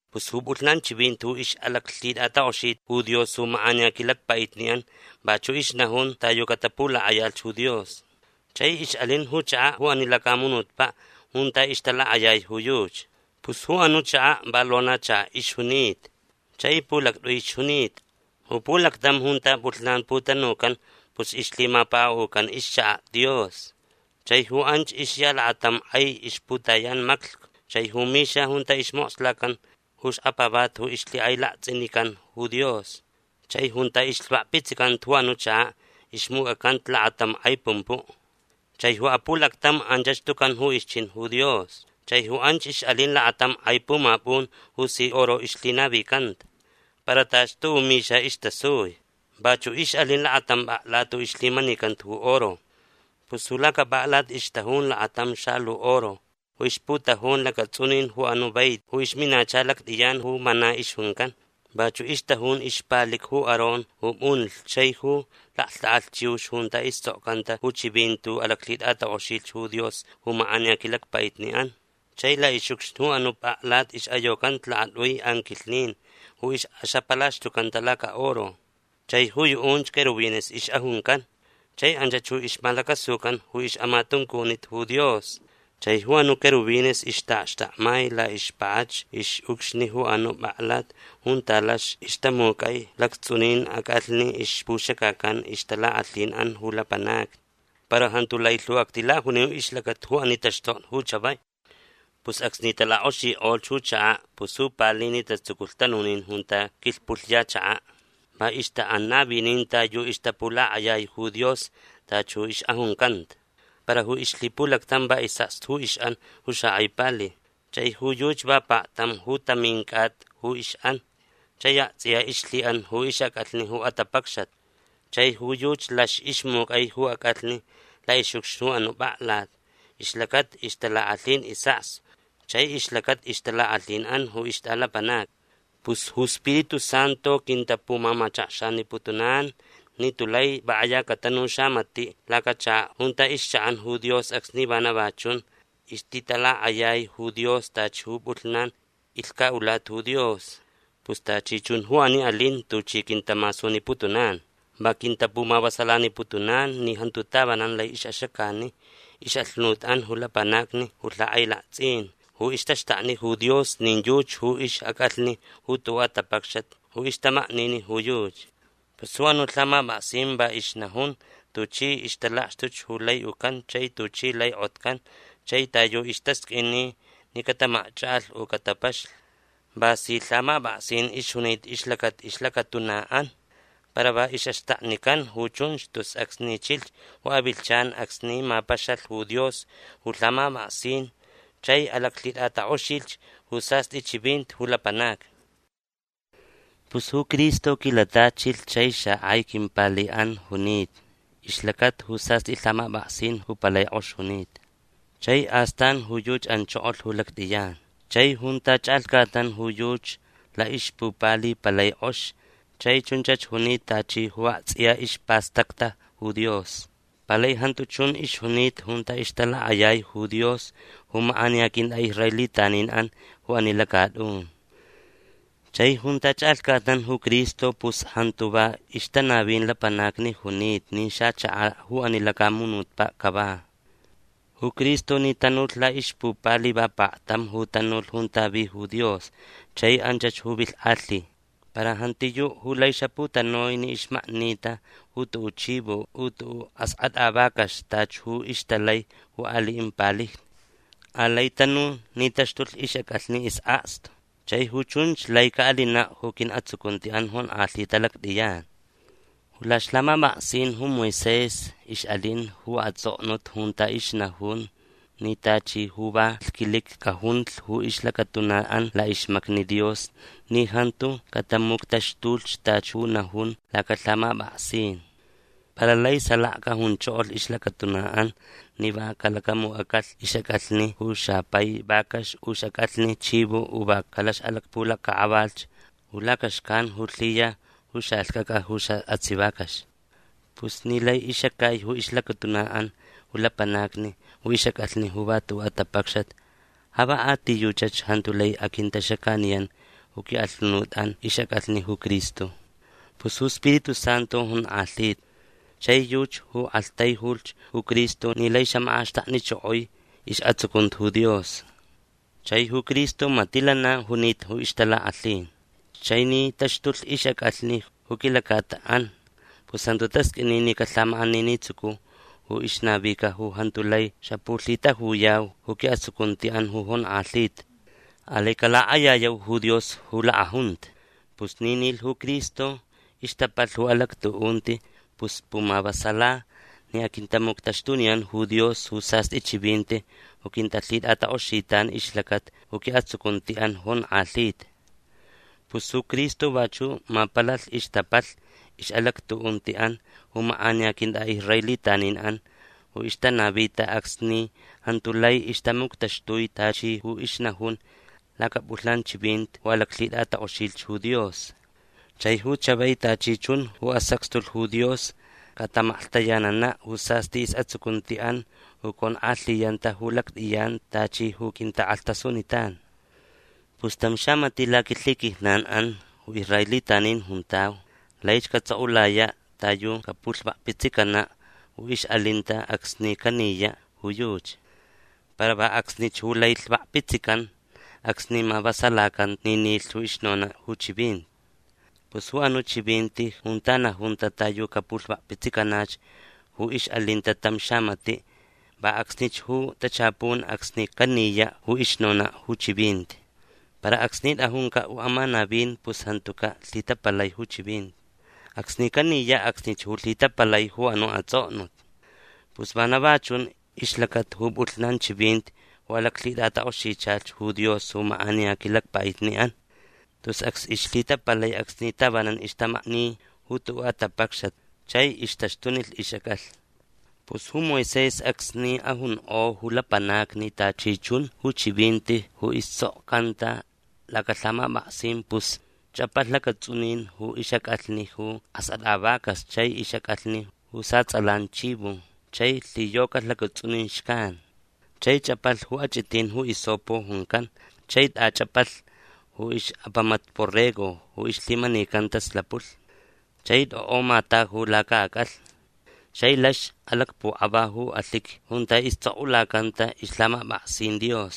Pus ju pʼulhnan chivinti ju ixʼalaclhitʼatakʼoxita ju Dios ju makʼaniya quilacpaʼitniʼan vachuʼ ixnajun ta yu catapulakʼayalh ju Dios. Chai ixʼalin ju chakaʼ ju ani lacamunutpaʼ junta ixtalakʼayai ju yuchi. Pus ju anuʼ chakaʼ va lonachakaʼ ixjunita. Chai pulactʼui ixjunita. Ju pulactam junta pʼulhnan putanucan pus ixlhimapakaʼucan ixchakaʼ Dios. Chai ju anch ixya lakatam kʼai ixputayan maclhcu chai ju mixa junta ismokslacan ju xkapavati ju ixlhikʼailaktsʼinican ju Dios. Chai junta ixlhvakpitsicanta ju anuʼ chakaʼ ixmucʼacanta lakatam kʼai pumpuʼ. Chai ju apulactam anchach tucan ju ixchin ju Dios. Chai ju anch ixʼalin lakatam kʼai pumapʼun ju si oro ixlhinavicanta. Para tachi tuʼuʼ mixa istasui. Vachuʼ ixʼalin lakatam pʼaklat ju ixlhimanicanta ju oro. Pus ju lacapʼaklat ixtajun lakatam xalu oro ju ixputajun lacatsʼunin ju anuʼ vaiti ju ixminacha lactʼiyan ju mana ixjuncan. Vachuʼ ixtajun ixpalic ju Aarón ju pʼunlh chai ju laklhtʼakʼalh chiux junta istsʼokcanta ju chivinti ju alaclhitʼatakʼoxilh ju Dios ju makʼaniya quilacpaʼitniʼan. Chai laʼixʼucxni ju anuʼ pʼaklat ixʼayocanta lakatʼui anquilhnin ju ixʼaxapalaxtucanta lacaʼoro. Chai ju yuʼunch querubines ixʼajuncan. Chai anchach ju ixmalacasucan ju ixʼamatuncunit ju Dios. Chai ju anuʼ querubines ixtaʼakxtakmai laʼixpakʼachu ixʼucxni ju anuʼ pʼaklat junta lax ixtamucʼai lactsʼunin acʼalhni ixpuxacacan ixtalakʼalhinʼan ju lapanacni. Para jantu lai lhu actilajuniu ixlacata ju ani taxtokni ju chavai. Pus acsni talakʼoxikʼolh ju chakaʼ pus ju palijni tatsuculh tanunin junta quilhpʼulhya chakaʼ. Va ixtaʼan navinin ta yu ixtapulakʼayai ju Dios tachi ju ixʼajuncanta. Para ju ixlhipulactam va isʼakstu ju ixʼan ju xakʼai pali. Chai ju yuchi va paktam ju tamin cʼata ju ixʼan. Chai aktsʼiya ixlhiʼan ju ixʼacʼalhni ju atapacxat. Chai ju yuchi lax ixmucʼai ju acʼalhni laʼixʼucxni ju anuʼ pʼaklat ixlacata ixtalakʼalhin isʼakstu chai ixlacata ixtalakʼalhinʼan ju ixtʼalapanacni. Pus ju Spiritu Santu quintapumamachakxaniputunan ni tulai va kʼaya catanu xamatiʼ lacachakaʼ junta ixchaʼan ju Dios acsni vana chun ixtitalakʼayai ju Dios tachi ju pʼulhnan ilhcaʼulata ju Dios. Pus tachi chun ju ani alin tuchi quintamasuniputunan. Va quintamavasalaniputunan ni jantu tavanan lai ixʼaxacani ixʼalhunutʼan ju lapanacni ju lhakʼailaktsʼin ju ixtaxtakni ju Dios nin yuchi ju ixʼacʼalhni ju tuʼuʼ atapacxat ju ixtamaknini ju yuchi. Pus ju anuʼ lhamapʼaksin va ixnajun tuchi ixtalakxtuch ju lai ucan chai tuchi lai kʼotcan chai ta yu istasqʼuini ni catamakchakʼalh u catapaxlh. Va si lhamapʼaksin ixjunita ixlacata ixlacatunaʼan. Para va ixʼaxtaknican ju chunch tus acsni chilh ju avilhchan acsni mapaxalh ju Dios ju lhamapʼaksin chai alaclhitʼatakʼoxilh ju sastʼi chivinti ju lapanacni. Pus ju Cristo quilatachilh chai xakʼai quimpaliʼan junita ixlacata ju sastʼi lhamapʼaksin ju palai kʼox junita. Chai astan ju yuchi anchokolh ju lactʼiyan. Chai junta chʼalhcatnan ju yuchi laʼixpupali palai kʼox chai chunchach junita tachi ju aktsʼiya ispastacta ju Dios. Palai jantu chun ixjunita junta ixtalakʼayai ju Dios ju makʼaniya quintʼaʼisraelitaninʼan ju ani lacatʼun. Chai junta chʼalhcatnan ju Cristo pus jantu va ixtanavin lapanacni junita nin xachakaʼ ju ani lacamunutpaʼ cava. Ju Cristo ni tanulh laʼixpupali va paktam ju tanulh junta vi ju Dios chai anchach ju vilhkʼalhi. Para jantiyuʼ ju lai xaputanui ni ixmaknita ju tuʼuʼ chivo u tuʼuʼ askʼatʼa vacax tachi ju ixtalai ju aliʼin palijni. Alai tanu ni taxtulh ixʼacʼalhni isʼakstu. Chai ju chunch lai caʼalinaʼ ju quiʼatsucuntiʼan jonkʼalhita lactʼiyan. Ju laʼixlhamapʼaksin ju Moisés ixʼalin ju atsʼoknut junta ixnajun ni tachi ju va lhquiliqui cajunlh ju ixlacatunaʼan laʼixmacni Dios ni jantu catamuctaxtulh tachi ju najun lacalhamapʼaksin. Para lai salaka cajunchokolh ixlacatunaʼan ni va calacamucʼacalh ixʼacʼalhni ju xapai vacax u ixʼacʼalhni chivo u va calaxʼalacpulacʼakʼavalh ju lacaxcan ju lhiya ju xalhcʼacʼa ju saʼatsiʼ vacax. Pus ni lai ixacai ju ixlacatunaʼan ju lapanacni ju ixʼacʼalhni ju va tuʼuʼ atapacxat ja va a ti yuchach jantu lai aquintaxacaniyan ju quiʼalhunutʼan ixʼacʼalhni ju Cristo. Pus ju Spiritu Santu jonkʼalhita. Chai yuchi ju aktaijulh ju Cristo ni lai xamakʼaxtaknichokoi isʼatsucunti ju Dios. Chai ju Cristo matiʼ lana junita ju ixtalakʼalhin. Chai ni taxtulh ixʼacʼalhni ju quilacataʼan pus jantu tasqʼuini ni calhamakʼaninitsucu ju ixnavica ju jantu lai xapulhitajuyau ju quiʼatsucuntiʼan ju jonkʼalhita. Alai calakʼayayau ju Dios ju lakʼajunta. Pus ni nilh ju Cristo ixtapalh ju alactuʼunti pus pumavasala ni aquintamuctaxtuniyan ju Dios ju sastʼi chivinti ju quintalhitʼatakʼoxitan ixlacata ju quiʼatsucuntiʼan jonkʼalhita. Pus ju Cristo vachuʼ mapalalh ixtapalh ixʼalactuʼuntiʼan ju makʼaniya quintʼaʼisraelitaninʼan ju ixtanavita acsni jantu lai ixtamuctaxtui tachi ju ixnajun lacapʼulhnan chivinti ju alaclhitʼatakʼoxilh ju Dios. Chai ju chavai tachi chun ju asacxtulh ju Dios cataʼamaklhtayananaʼ ju sastʼi isʼatsucuntiʼan ju conkʼalhiyanta ju lactʼiyan tachi ju quintakʼalhtasunitan. Pus tam xamatiʼ laquilhiquijnanʼan ju israelitanin juntau laich catsʼokʼulayaʼ ta yu capulhvakpitsicanaʼ ju ixʼalinta acsni caniyaʼ ju yuchi. Para va acsnich ju lai lhvakpitsican acsni mavasalacanta ni nilh ju ixnonaʼ ju chivinti. Pus ju anuʼ chivinti junta najunta ta yu capulhvakpitsicanach ju ixʼalinta tam xamatiʼ va acsnich ju tachapun acsni caniyaʼ ju ixnonaʼ ju chivinti. Para acsni tʼajuncaʼ ju amanavin pus jantucaʼ lhitapalai ju chivinti. Acsni caniyaʼ acsnich ju lhitapalai ju anuʼ atsʼoknut. Pus vana va chun ixlacata ju pʼulhnan chivinti ju alaclhitʼatakʼoxichalh ju Dios ju makʼaniya quilacpaʼitniʼan. Tus acs ixlhitapalai acsni tavananch ixtamakni ju tuʼuʼ atapacxat chai ixtaxtunilh ixʼacʼalhni. Pus ju Moisés acsni ajunkʼo ju lapanacni tachi chun ju chivinti ju istsʼokcanta lacalhamapʼaksin pus chʼapalh lacatsʼunin ju ixʼacʼalhni ju askʼatʼa vacax chai ixʼacʼalhni ju satsʼalan chivo chai lhiyocalh lacatsʼunin xcan. Chai chʼapalh ju achʼitin ju hisopo juncan chai tʼachʼapalh ju ixʼapamat borrego ju ixlhimanicanta slapulh. Chai tʼokʼo mataju lacaʼacʼalhni. Chai lax alacpukʼava ju alhiqui junta istsʼokʼulacanta ixlhamapʼaksin Dios.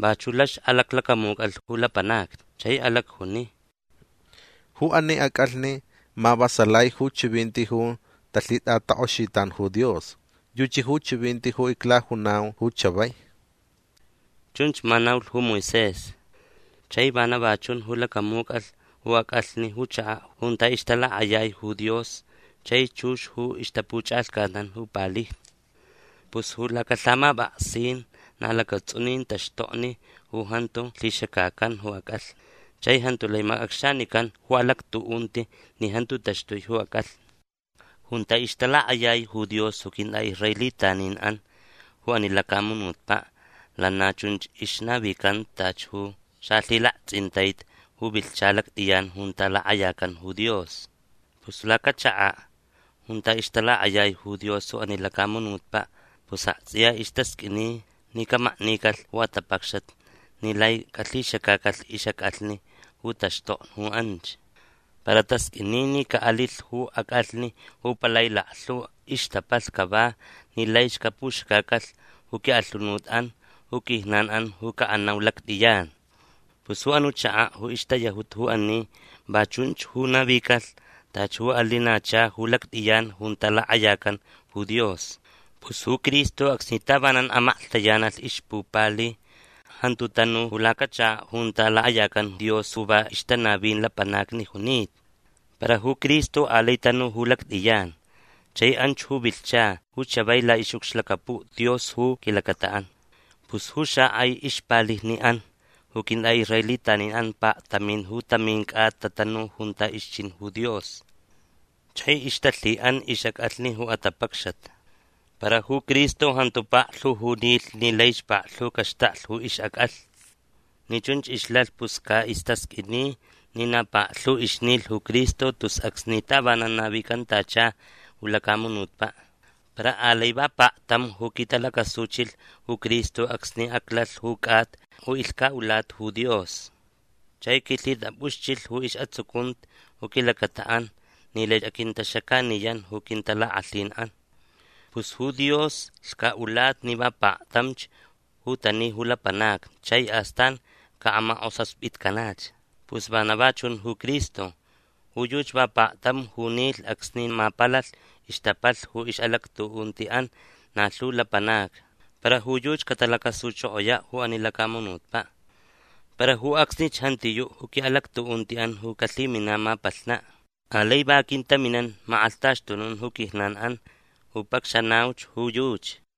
Vachuʼ lax alaclacamucʼalh ju lapanacni. Chai alacjuni: “Ju ani acʼalhni mavasalai ju chivinti ju talhitʼatakʼoxitan ju Dios. Yuchi ju chivinti ju iclajunau ju chavai”. Chunch ma naulh ju Moisés. Chai vana va chun ju lacamucʼalh ju acʼalhni ju chakaʼ junta ixtalakʼayai ju Dios chai chux ju ixtapuchʼalhcatnan ju palijni. Pus ju lacalhamapʼaksin na lacatsʼunin taxtokni ju jantu lhixacacan ju acʼalhni. Chai jantu lai macʼacxanican ju alactuʼunti ni jantu taxtui ju acʼalhni. Junta ixtalakʼayai ju Dios ju quintʼaʼisraelitaninʼan ju ani lacamunutpaʼ lana chunch ixnavicanta tachi ju xalhilaktsʼintaiti ju vilhcha lactʼiyan junta lakʼayacan ju Dios. Pus lacachakaʼ junta ixtalakʼayai ju Dios ju ani lacamunutpaʼ pus aktsʼiya istasqʼuini ni camaknicalh ju atapacxat ni lai calhixacacalh ixʼacʼalhni ju taxtokni ju anch. Para tasqʼuini ni caʼalilh ju acʼalhni ju palai laklhu ixtapalh cava ni laich capuxacacalh ju quiʼalhunutʼan ju quijnanʼan ju caʼanau ju lactʼiyan. Pus ju anuʼ chakaʼ ju ixtayajuta ju ani va chunch ju navicalh tachi ju alinacha ju lactʼiyan junta lakʼayacan ju Dios. Pus ju Cristo acsni tavanan amaklhtayanalh ixpupali jantu tanu ju lacachakaʼ junta lakʼayacan Dios ju va ixtanavin lapanacni junita. Para ju Cristo alai tanu ju lactʼiyan. Chai anch ju vilhcha ju chavai laʼixʼucxlacapuʼ Dios ju quilacataʼan. Pus ju xakʼai ixpalijniʼan ju quintʼaʼisraelitanin paktamin ju tamin cʼata tatanu junta ixchin ju Dios. Chai ixtalhiʼan ixʼacʼalhni ju atapacxat. Para ju Cristo jantu paklhu ju nilh ni laich paklhu caxtaklh ju ixʼacʼalhni. Ni chunch ixlalh pus caʼistasqʼuini ni na paklhu ixnilh ju Cristo tus acsni tavanan navicantacha ju lacamunutpaʼ. Para alai va paktam ju quitalacasuchilh ju Cristo acsni aclalh ju cʼata ju ilhcaʼulata ju Dios. Chai quilhitapʼuxchilh ju isʼatsucunti ju quilacataʼan ni lai aquintaxacaniyan ju quintalakʼalhinʼan. Pus ju Dios lhcaʼulata ni va paktamch ju tani ju lapanacni chai astan caʼamakʼosaspitcanach. Pus vana va chun ju Cristo. Ju yuchi va paktam ju nilh acsni mapalalh ixtapalh ju ixʼalactuʼuntiʼan na lhu lapanacni. Para ju yuchi catalacasuchokoyaʼ ju ani lacamunutpaʼ. Para ju acsnich jantiyuʼ ju quiʼalactuʼuntiʼan ju calhiminaʼ mapalhnaʼ. Alai va aquintaminan makʼalhtaxtunun ju quijnanʼan ju pacxanauch ju yuchi.